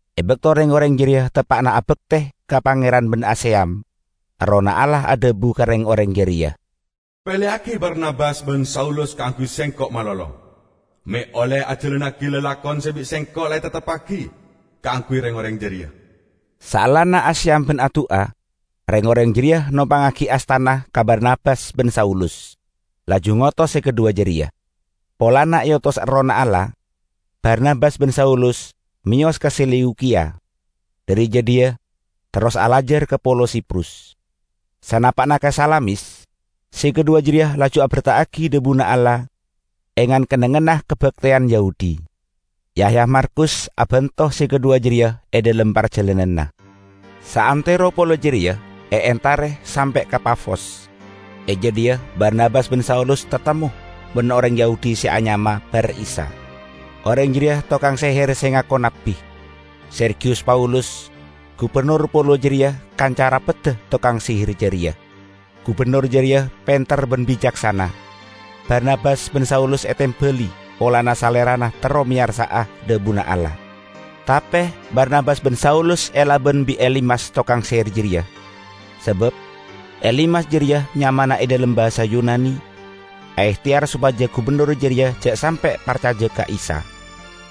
E bakto reng-oreng jareya teppa'na abakte ka Pangeran ban aseyam, Errohna Allah adhabu ka reng-oreng jareya, "Peleyagi Barnabas ban Saulus kaangguy Sengko' malolo, me' olle ajalannagi lalakon se bi' Sengko' la etepteppagi kaangguy reng-oreng jareya." Saellana aseyam ban adu'a, reng-oreng jareya nompangngagi astana ka Barnabas ban Saulus, laju ngotos se kadhuwa jareya. Polana eotos Errohna Allah, Barnabas ban Saulus meyos ka Seleukiya. Dhari jadhiya terros alajar ka polo Siprus. Sanapa'na ka Salamis, se kadhuwa jareya laju aberta'agi dhabuna Allah e ngan-kennengnganna kabakteyan Yahudi. Yahya Markus abanto se kadhuwa jareya e dhalem parjalananna. Saantero polo jareya eentare sampe' ka Pafos. E jadhiya Barnabas ban Saulus tatemmo ban oreng Yahudi se anyama Bar Isa. Oreng jareya tokang seher se ngako nabbi. Sergiyus Paulus, gubennor polo jareya kanca rapedda tokang seher jareya. Gubennor jareya penter ban bicaksana. Barnabas ban Saulus etembali polana salerana terro meyarsa'a dhabuna Allah. Tape Barnabas ban Saulus elaban bi' Elimas tokang seher jareya, sabab Elimas (jareya nyamana e dhalem basa Yunani) aehteyar sopaja gubennor jareya ja' sampe' parcaja ka Isa.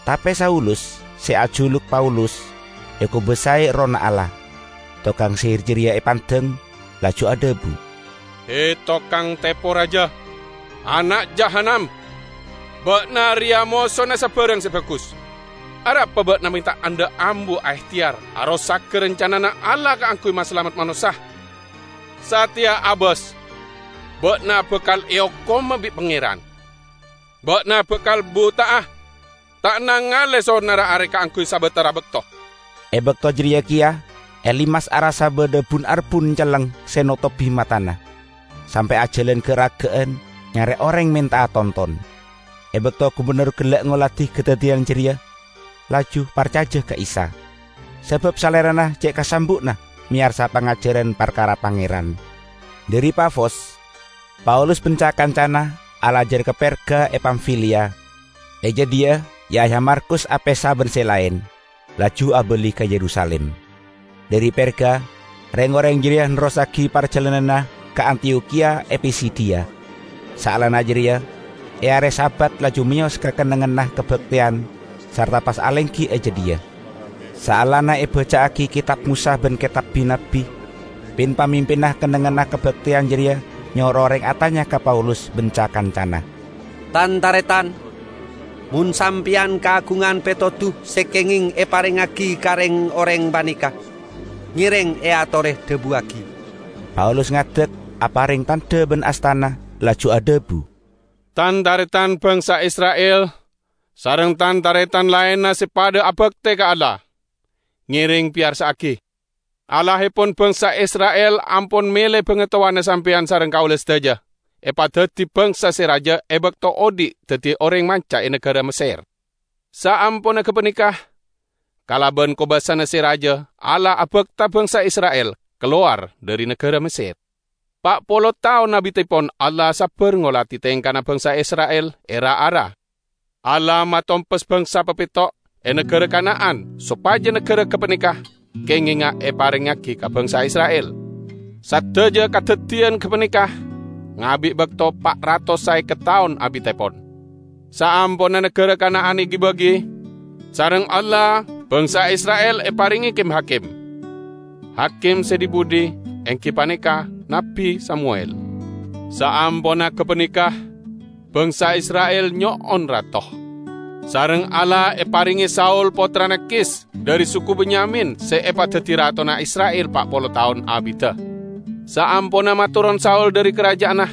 Tape Saulus -- se ajuluk Paulus -- ekobasae Errohna Allah; tokang seher jareya epandeng, laju adhabu, "He, tokang tepo raja, ana' jahannam! Ba'na reya mosona sabarang se bagus. Arapa ba'na me' ta' endha' ambu aehteyar arosaga rancanana Allah kaangguy masalamet manossa? Sateya abas, ba'na bakal eokoma bi' Pangeran! Ba'na bakal buta'a, ta' nangale sonarra are kaangguy sabatara bakto." E bakto jareya keya Elimas arassa badha bun-arbun celleng se notobi matana, sampe' ajalan ga'-raga'an nyare oreng menta'a tonton. E bakto gubennor gella' ngoladi kadaddiyan jareya, laju parcaja ka Isa; sabab salerana ce' kasambu'na meyarsa pangajaran parkara Pangeran. Dhari Pafos, Paulus ban ca-kancana alajar ka Perga e Pamfiliya. E jadhiya Yahya Markus apesa ban se laen, laju abali ka Yerusalim. Dhari Perga, reng-oreng jareya nerrossagi parjalananna ka Antiyokhiya e Pisidiya, saellana jareya, e are Sabat laju meyos ka kennengnganna kabakteyan sarta pas alenggi e jadhiya. Saellana ebaca'agi Ketab Mosa ban Ketab Bi-nabbi, pin-pamimpinna kennengnganna kabakteyan jareya nyoro oreng atanya ka Paulus ban ca-kancana, "Tan-taretan, mon sampeyan kaagungan petodu se kengeng eparengngagi ka reng-oreng paneka, ngereng eatore dhabuwagi." Paulus ngadek, apareng tandha ban astana, laju adhabu, "Tan-taretan bangsa Isra'il sareng tan-taretan laenna se padha abakte ka Allah! Ngereng peyarsa'agi! Allahepon bangsa Isra'il ampon mele bangatowana sampeyan sareng kaula sadaja, epadaddi bangsa se raja e bakto odhi' daddi oreng manca e nagara Messer. Saamponna gapaneka, kalaban kobasana se raja Allah abakta bangsa Isra'il kalowar dhari nagara Messer. Pa' polo taon abittepon Allah sabbar ngoladi tengkana bangsa Isra'il e ra-ara. Allah matompes bangsa papetto' e nagara Kana'an sopaja nagara gapaneka kengenga eparengngagi ka bangsa Isra'il. Sadaja kadaddiyan gapaneka ngabi' bakto pa' ratos saeket taon abittepon. Saamponna nagara Kana'an egi-bagi, sareng Allah bangsa Isra'il eparenge kim-hakim. Hakim se dhi-budhi enggi paneka Nabbi Samuwel. Saamponna gapaneka bangsa Isra'il nyo'on rato. Sareng Allah eparenge Saul pottrana Kis dhari suku Benyamin se epadaddi ratona Isra'il pa' polo taon abidda. Saamponna matoron Saul dhari karaja'anna,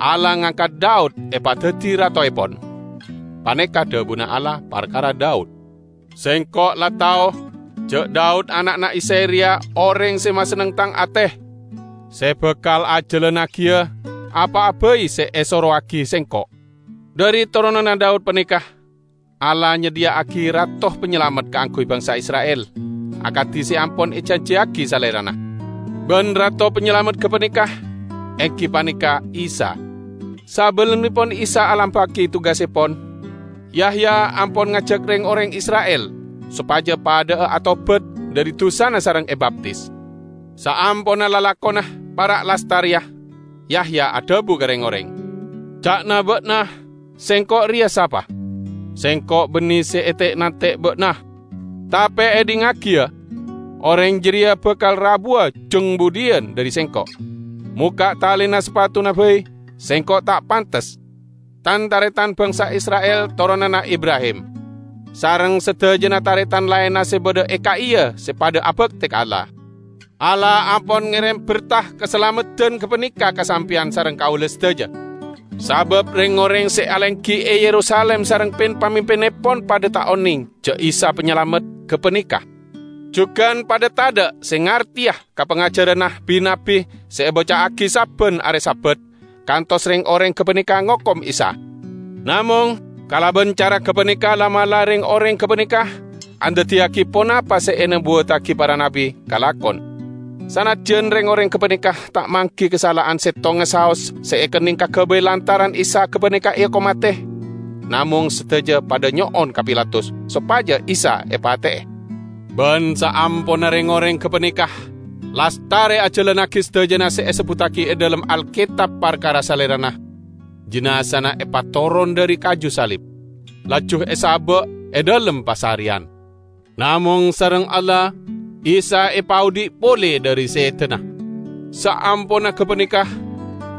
Allah ngangkat Daud epadaddi ratoepon. Paneka' dhabuna Allah parkara Daud, 'Sengko' la tao ja' Daud ana'na Isay reya oreng se masenneng Tang ate, se bakal ajalannagiya apa'a bai se esorowagi Sengko'.' Dhari toronanna Daud paneka Allah nyadhiya'agi Rato Panyalamet kaangguy bangsa Isra'il, akadi se ampon ejanjiyagi Salerana. Ban Rato Panyalamet gapaneka enggi paneka Isa. Sabellunnepon Isa alampa'agi tugassepon, Yahya ampon ngajak reng-oreng Isra'il sopaja padha'a atobat dhari dusana sareng ebaptis. Saamponna lalakonna para' lastareya, Yahya adhabu ka reng-oreng, 'Ca'na ba'na sengko' reya sapa? Sengko' banne se ete'-nante' ba'na. Tape edhingngagi, ya: oreng jareya bakal rabuwa jang budhiyan dhari sengko'; mokka' talena sapatuna bai sengko' ta' pantes.' Tan-taretan bangsa Isra'il toronanna Ibrahim, sareng sadajana taretan laenna se badha e ka'iya se padha abakte ka Allah! Allah ampon ngerem berta kasalameddan gapaneka ka sampeyan sareng kaula sadaja; sabab reng-oreng se alenggi e Yerusalim sareng pin-pamimpinnepon padha ta' oneng ja' Isa Panyalamet gapaneka; jugan padha tadha' se ngarteya ka pangajaranna bi-nabbi se ebaca'agi sabban are Sabat, kantos reng-oreng gapaneka ngokom Isa. Namong kalaban cara gapaneka la'-mala' reng-oreng gapaneka andaddiyagi ponapa se enobuwattagi para nabbi kalakon. Sanajjan reng-oreng gapaneka ta' manggi kasala'an settonga saos se ekenneng kagabay lantaran Isa gapaneka eokom mate, namong sadaja padha nyo'on ka Pilatus sopaja Isa epate'e. Ban saamponna reng-oreng gapaneka lastare ajalannagi sadajana se esebbuttagi e dhalem Alketab parkara Salerana, jinazana epatoron dhari kaju salib, laju esaba' e dhalem pasareyan. Namong sareng Allah Isa epaodhi' pole dhari sedana. Saamponna gapaneka,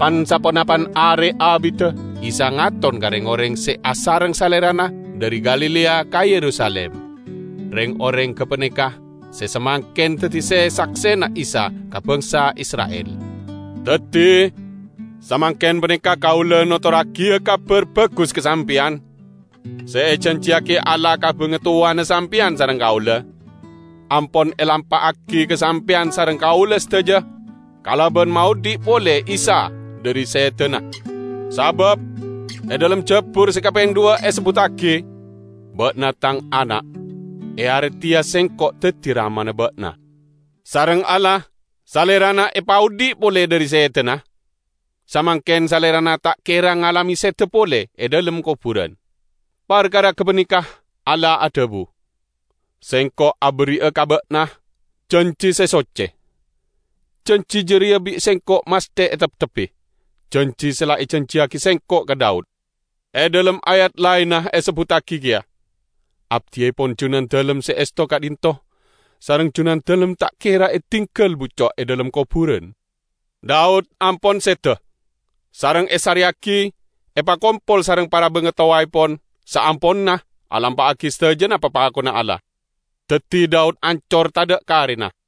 pan-saponapan are abidda Isa ngaton ka reng-oreng se asareng Salerana dhari Galilea ka Yerusalim. Reng-oreng gapaneka se samangken daddi se-saksena Isa ka bangsa Isra'il. Daddi, samangken paneka kaula notorragiya Kabar Bagus ka sampeyan: Se ejanjiyagi Allah ka bangatowana sampeyan sareng kaula, ampon elampa'agi ka sampeyan sareng kaula sadaja kalaban maodhi' pole Isa dhari sedana. Sabab e dhalem Jabur se kapeng dhuwa' esebbuttagi, 'Ba'na Tang Ana', e are teya Sengko' daddi Ramana Ba'na.' Sareng Allah Salerana epaodhi' pole dhari sedana. Samangken Salerana ta' kera ngalame seda pole e dhalem koburan. Parkara gapaneka Allah adhabu, 'Sengko' aberri'a ka Ba'na janji se socce; janji jareya bi' Sengko' masthe eteptebbi, janji se la ejanjiyagi Sengko' ka Daud.' E dhalem ayat laenna esebbuttagi keya, 'Abdiepon Junandalem se esto ka'dhinto' sareng Junandalem ta' kera edinggal bucco' e dhalem koburan.' Daud ampon seda, sareng esareyagi epakompol sareng para bangatowaepon saamponna alampa'agi sadajana papakonna Allah. Daddi Daud ancor tadha' karena.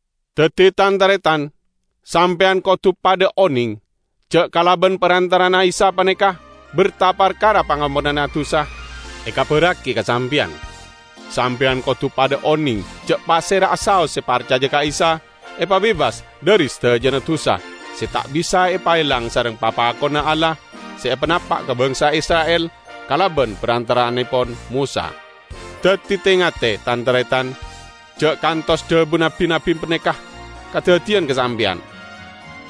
Daddi tan-taretan, sampeyan kodu padha oneng, ja' kalaban parantara'anna Isa paneka berta parkara pangamponanna dusa ekabarragi ka sampeyan; sampeyan kodu padha oneng ja' pasera'a saos se parcaja ka Isa, epabebas dhari sadajana dusa se ta' bisa epaelang sareng papakonna Allah se epanapa' ka bangsa Isra'il kalaban parantara'annepon Mosa. Daddi te-ngate, tan-taretan, ja' kantos dhabuna bi-nabbi paneka kadaddiyan ka sampeyan,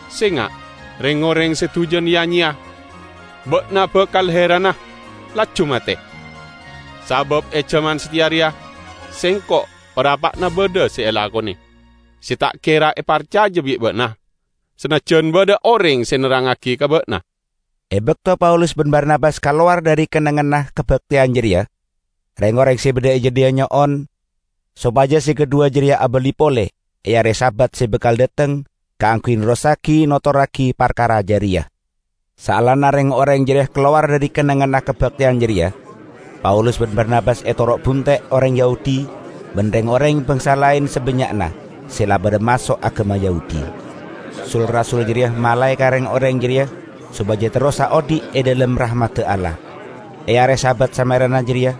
'Senga', reng-oreng se dujan ya-nyeya! Ba'na bakal heranna, laju mate! Sabab e jaman sateya reya Sengko' parappa'na badha se elakone, se ta' kera eparcaja bi' ba'na, sanajjan badha oreng se nerrangngagi ka ba'na!' " E bakto Paulus ban Barnabas kalowar dhari kennengnganna kabakteyan jareya, reng-oreng se badha e jadhiya nyo'on sopaja se kadhuwa jareya abali pole e are Sabat se bakal dhateng kaangguy nerrossagi notorragi parkara jareya. Saellana reng-oreng jareya kalowar dhari kennengnganna kabakteyan jareya, Paulus ban Barnabas etoro' bunte' oreng Yahudi ban reng-oreng bangsa laen sabannya'na se la padha maso' agama Yahudi. Sul-rasul jareya malae ka reng-oreng jareya sopaja terrosa odhi' e dhalem rahmadda Allah. E are Sabat samarena jareya,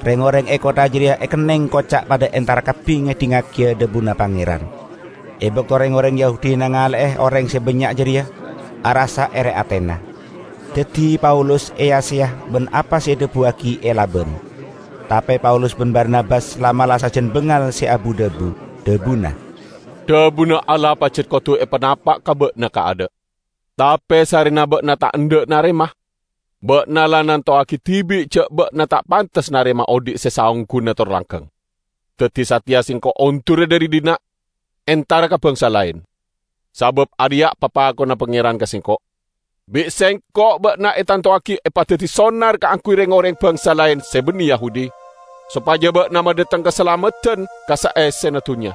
reng-oreng e kottha jareya ekenneng koca' padha entar kabbi ngedhingngagiya dhabuna Pangeran. E bakto reng-oreng Yahudi nangale'e oreng se bannya' jareya, arassa ere atena. Daddi Paulus eya-seya ban apa se edhabuwagi elaban. Tape Paulus ban Barnabas la'-mala' sajan bangal se abu-dhabu. Dhabuna, "Dhabuna Allah pajat kodu epanapa' ka ba'na kaadha'. Tape sarrena ba'na ta' endha' narema, ba'na la nantowagi dibi' ja' ba'na ta' pantes narema odhi' se saongguna tor langgeng. Daddi sateya sengko' ondura dhari dhinna', entara ka bangsa laen. Sabab areya' papakonna Pangeran ka sengko': 'Bi' Sengko' ba'na etantowagi epadaddi sonar kaangguy reng-oreng bangsa laen se banne Yahudi, sopaja ba'na madhateng kasalameddan ka saessena dunnya.' "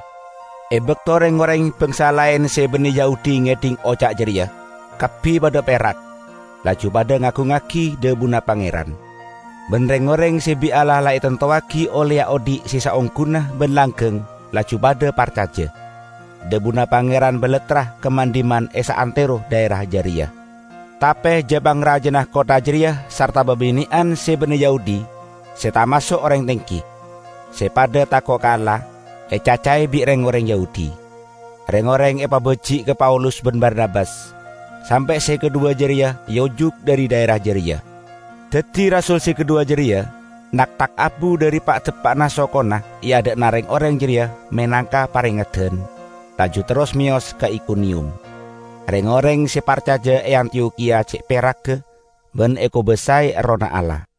E bakto reng-oreng bangsa laen se banne Yahudi ngedhing oca' jareya, kabbi padha perak, laju padha ngagungngagi dhabuna Pangeran. Ban reng-oreng se bi' Allah la etantowagi olleya odhi' se saongguna ban langgeng laju padha parcaja. Dhabuna Pangeran balattra ka man-dhimman e saantero dhaera jareya. Tape ja-pangrajana kottha jareya sarta babine'an se banne Yahudi se tamaso' oreng tenggi, se padha tako' ka Allah, ecacae bi' reng-oreng Yahudi. Reng-oreng epabaji' ka Paulus ban Barnabas, sampe' se kadhuwa jareya eojuk dhari dhaera jareya. Daddi rasul se kadhuwa jareya nakthak abu dhari pa'-dapa'na sokona e adha'na reng-oreng jareya menangka parengeddan, laju terros meyos ka Ikoniyum. Reng-oreng se parcaja e Antiyokhiya ce' peragga, ban ekobasae Errohna Allah.